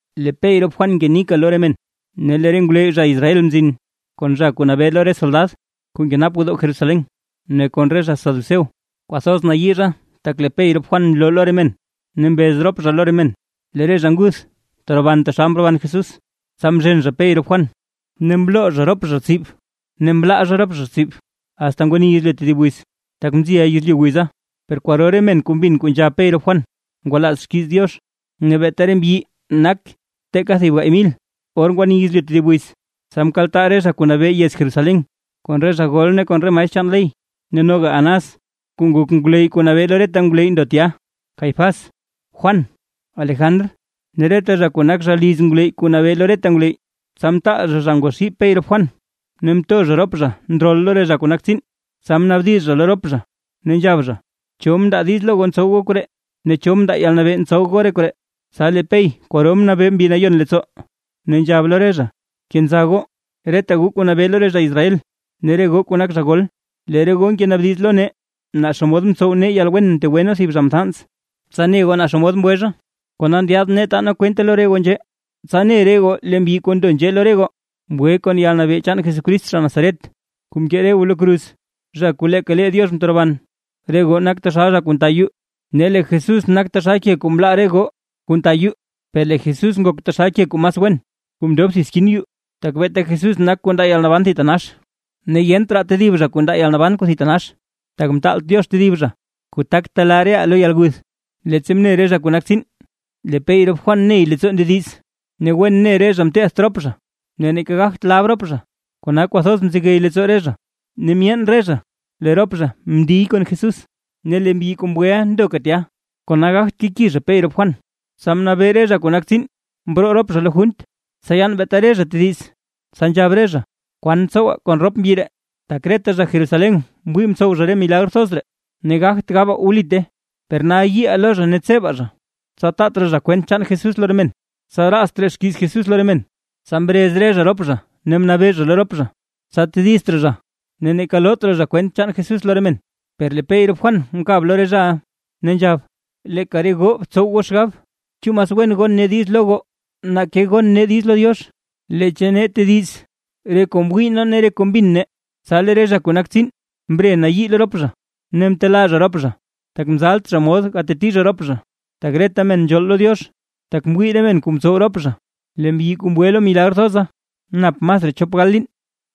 Lee Pey rop Juan ngenika lo re men, ne lee re ngwleyy zha Israel mzin kon zha kuu nabee lo re soldad kuu nkenap gwodoo Jerusalén ne kon re zha saduceo. Kwathoz nayii zha tak lee Pey rop Juan nloo lo re men, ne mbez rop zha lo re men; lee re zha nguth teroban taxal mroban Jesús. Tsa mzhen zha Pey rop Juan, ne mloo zha rop zha tsib ne mlaa zha rop zha tsib, asta ngwani yezlyu tedib wiz, tak mziya yezlyu wiza. Per kwaro re men kuu mbin kuu nzhab Pey rop Juan ngwalaaz xkiiz Diox, ne beeta re mbyi nak teeka thib gaay mil. Or ngwani yezlyu tedib wiz, tsa mkaltaa re zha kuu nabee yez Jerusalén, kon re zha gol ne kon re maestr chaan ley; ne noga Anás kuu nak ngwleyy kuu nabee lo reta ngwleyy ndo tya, Caifás, Juan, Alejandr ne reta zha kuu nak zha liz ngwleyy kuu nabee lo reta ngwleyy. Tsa mtaal zha zha ngwaxii Pey rop Juan ne mto zha rop zha ndrol lo re zha kuu nak tsiin. Tsa mnaabdiz zha lo rop zha, ne nzhab zha: ―¿Cho mndaa diiz lo goo ntsow goo koree? ¿Ne cho mndaa yalnabee ntsow goo re koree? Tsa lee Pey kwaro mnabee Mbi Nayon leettsoo, ne nzhab lo re zha: ―Kenza goo, reta goo kuu nabee lo re zha Israel ne re goo kuu nak zha gol: Lee re goo ngenaabdiz lo nee, naa xomod mtsow nee yalwen mtegwe nee thib zha mthans, tsa ne goo naa xomod mgwe zha. Kona ndyaad nee taa nee kwente lo re goo nzhee, tsa ne re goo lee mbyi kuu ndo nzhee lo re goo, mgwe kon yalnabee chaan Jesucrist zha Nazaret kuu mkee re goo lo kruz, zha kuu leeka lee Diox mteroban. Re goo nak taxal zha kuu nta yuu ne lee Jesús nak taxal ke kuu mlaa re goo kuu nta yuu, per lee Jesús nak taxal ke kuu mas wen kuu mndob thib skin yuu. Tak beeta Jesús nak kuu ndaa yalnaban kuu thitanax, ne yent raa tedib zha kuu ndaa yalnaban kuu thitanax, tak mtaalt Diox tedib zha, kuu tak telaa reʼaa lo yalguth. Leettsa mne re zha kuu nak tsiin lee Pey rop Juan ney leettsoo ndediz, ne wen ne re zha mteedt rop zha, ne neeka gagt lab rop zha, kona kwathoz mzegey leettsoo re zha, ne myeen re zha lee rop zha mndiy kon Jesús. Ne lee mbyi kuu mgweʼa ndoka tya, kona gagt keki zha Pey rop Juan. Tsa mnabee re zha kuu nak tsiin, mroo rop zha lo junt, tsa yaan beeta re zha tediz. Tsa nzhab re zha: ―¿Kwan tsowaa kon rop mbyi ree? Tak reta zha Jerusalén mwii mtsow zha re milagr thoz ree, ne gagt gabaa wlite. Per nal yiiʼaa lo zha ne tseba zha, tsa taat raa zha kwent chaan Jesús lo re men, tsa raats raa xkiiz Jesús lo re men. Tsa mrez re zha rop zha ne mnabee zha lo rop zha, tsa tedizt raa zha zha ne neeka loot raa zha kwent chaan Jesús lo re men: Per lee Pey rop Juan mkab lo re zhaʼa ne nzhab: ―Leeka re goo btsow goo xgab, ¿chu mas wen gon nee diiz lo goo, nake gon nee diiz lo Diox? Leecha nee tediz re kuu mwii nee ne re kuu mbin nee. Tsa lee re zha kuu nak tsiin mre mnayii lo rop zha, ne mtelaa zha rop zha, tak mzalt zha mod gateti zha rop zha, tak reta men nzhool lo Diox, tak mwii re men kuu mtsow rop zha. Lee mbyi kuu mgwe lo milagr thoza, nap masraa chop gal liin.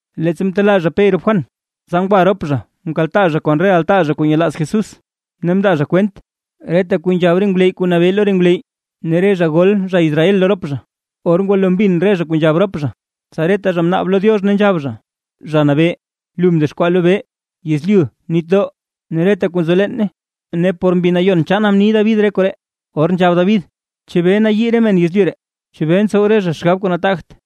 Leettsa mtelaa zha Pey rop Juan, tsa ngwa rop zha mkaltaa zha kon re altaa zha kuu nyelaaz Jesús, ne mndaa zha kwent reta kuu nzhab re ngwleyy kuu nabee lo re ngwleyy ne re zha gol zha Israel lo rop zha. Or ngwalo mbin re zha kuu nzhab rop zha, tsa reta zha mnaab lo Diox ne nzhab zha: ―Zha Nabee, lu mdexkwaa lobee, yezlyu, nitdoo ne reta kuu nzo leene, ne por Mbi Nayon chaana mni David re koree, or nzhab David: ¿Chebee nayii re men yezlyu ree? ¿Chebee ntsow re zha xgab kuu nataagt?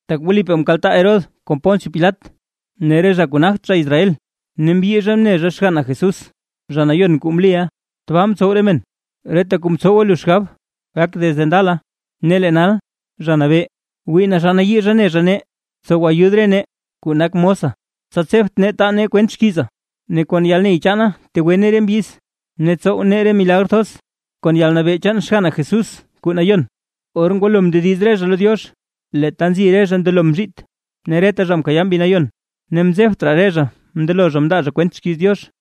’Tak wlipaa mkaltaa Herodes kon Poncio Pilat ne re zha kuu nagt zha Israel, ne mbyii zha mne zha xganna Jesús, zha nayon kuu mliʼa. Tbaa mtsow re men reta kuu mtsowa lu xgab gak desde ndala. Ne lee nal, Zha Nabee, wii naa xa nayii zha ne zha nee, tsow ayud re nee kuu nak mosa, tsa tsebt nee taa nee kwent xkiiza, ne kon yalney chaana tegwe nee re mbyiz, ne tsow nee re milagr thoz kon yalnabee chaan xganna Jesús kuu Nayon. Or ngwalo mndediz re zha lo Diox, lee ta nzi re zha mndelo mzhiit. Ne reta zha mkayaa Mbi Nayon, ne mzebt re zha mndelo zha mndaa zha kwent xkiiz Diox.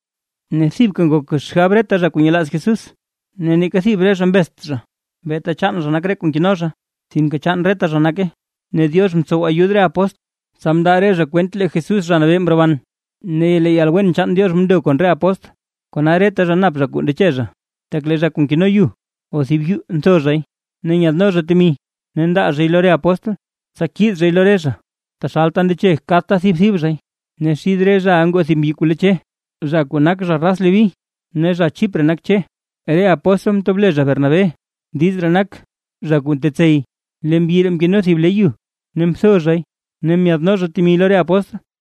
Ne thibka ngok xgab reta zha kuu nyelaaz Jesús. Ne neeka thib re zha mbezt zha beeta chaan zha nak re kuu nkeno zha, sinke chaan reta zha nake. Ne Diox mtsow ayud re apóstl, tsa mndaa re zha kwent lee Jesús Zha Nabee mroban, ne lee yalwen chaan Diox mndo kon re apóstl. Kona reta zha nap zha kuu ndeche zha, tak lee zha kuu nkeno yu o thib yuu ntho zhay, ne nyadno zha temi ne ndaa zhay lo re apóstl, tsa kiid zhay lo re zha, taxalta ndeche kadta thib thib zhay. Ne xid re zhaʼa ngoo thib mbyi kuu le Che, zha kuu nak zha raz Leví, ne zha Chipre nak Che. Re apóstl mtob le zha Bernabé. (Diiz ree nak: “Zha kuu ntetsey”.) Lee mbyi ree mkeno thib le yu, ne mtho zhay ne myaadno zha temi lo re apóstl.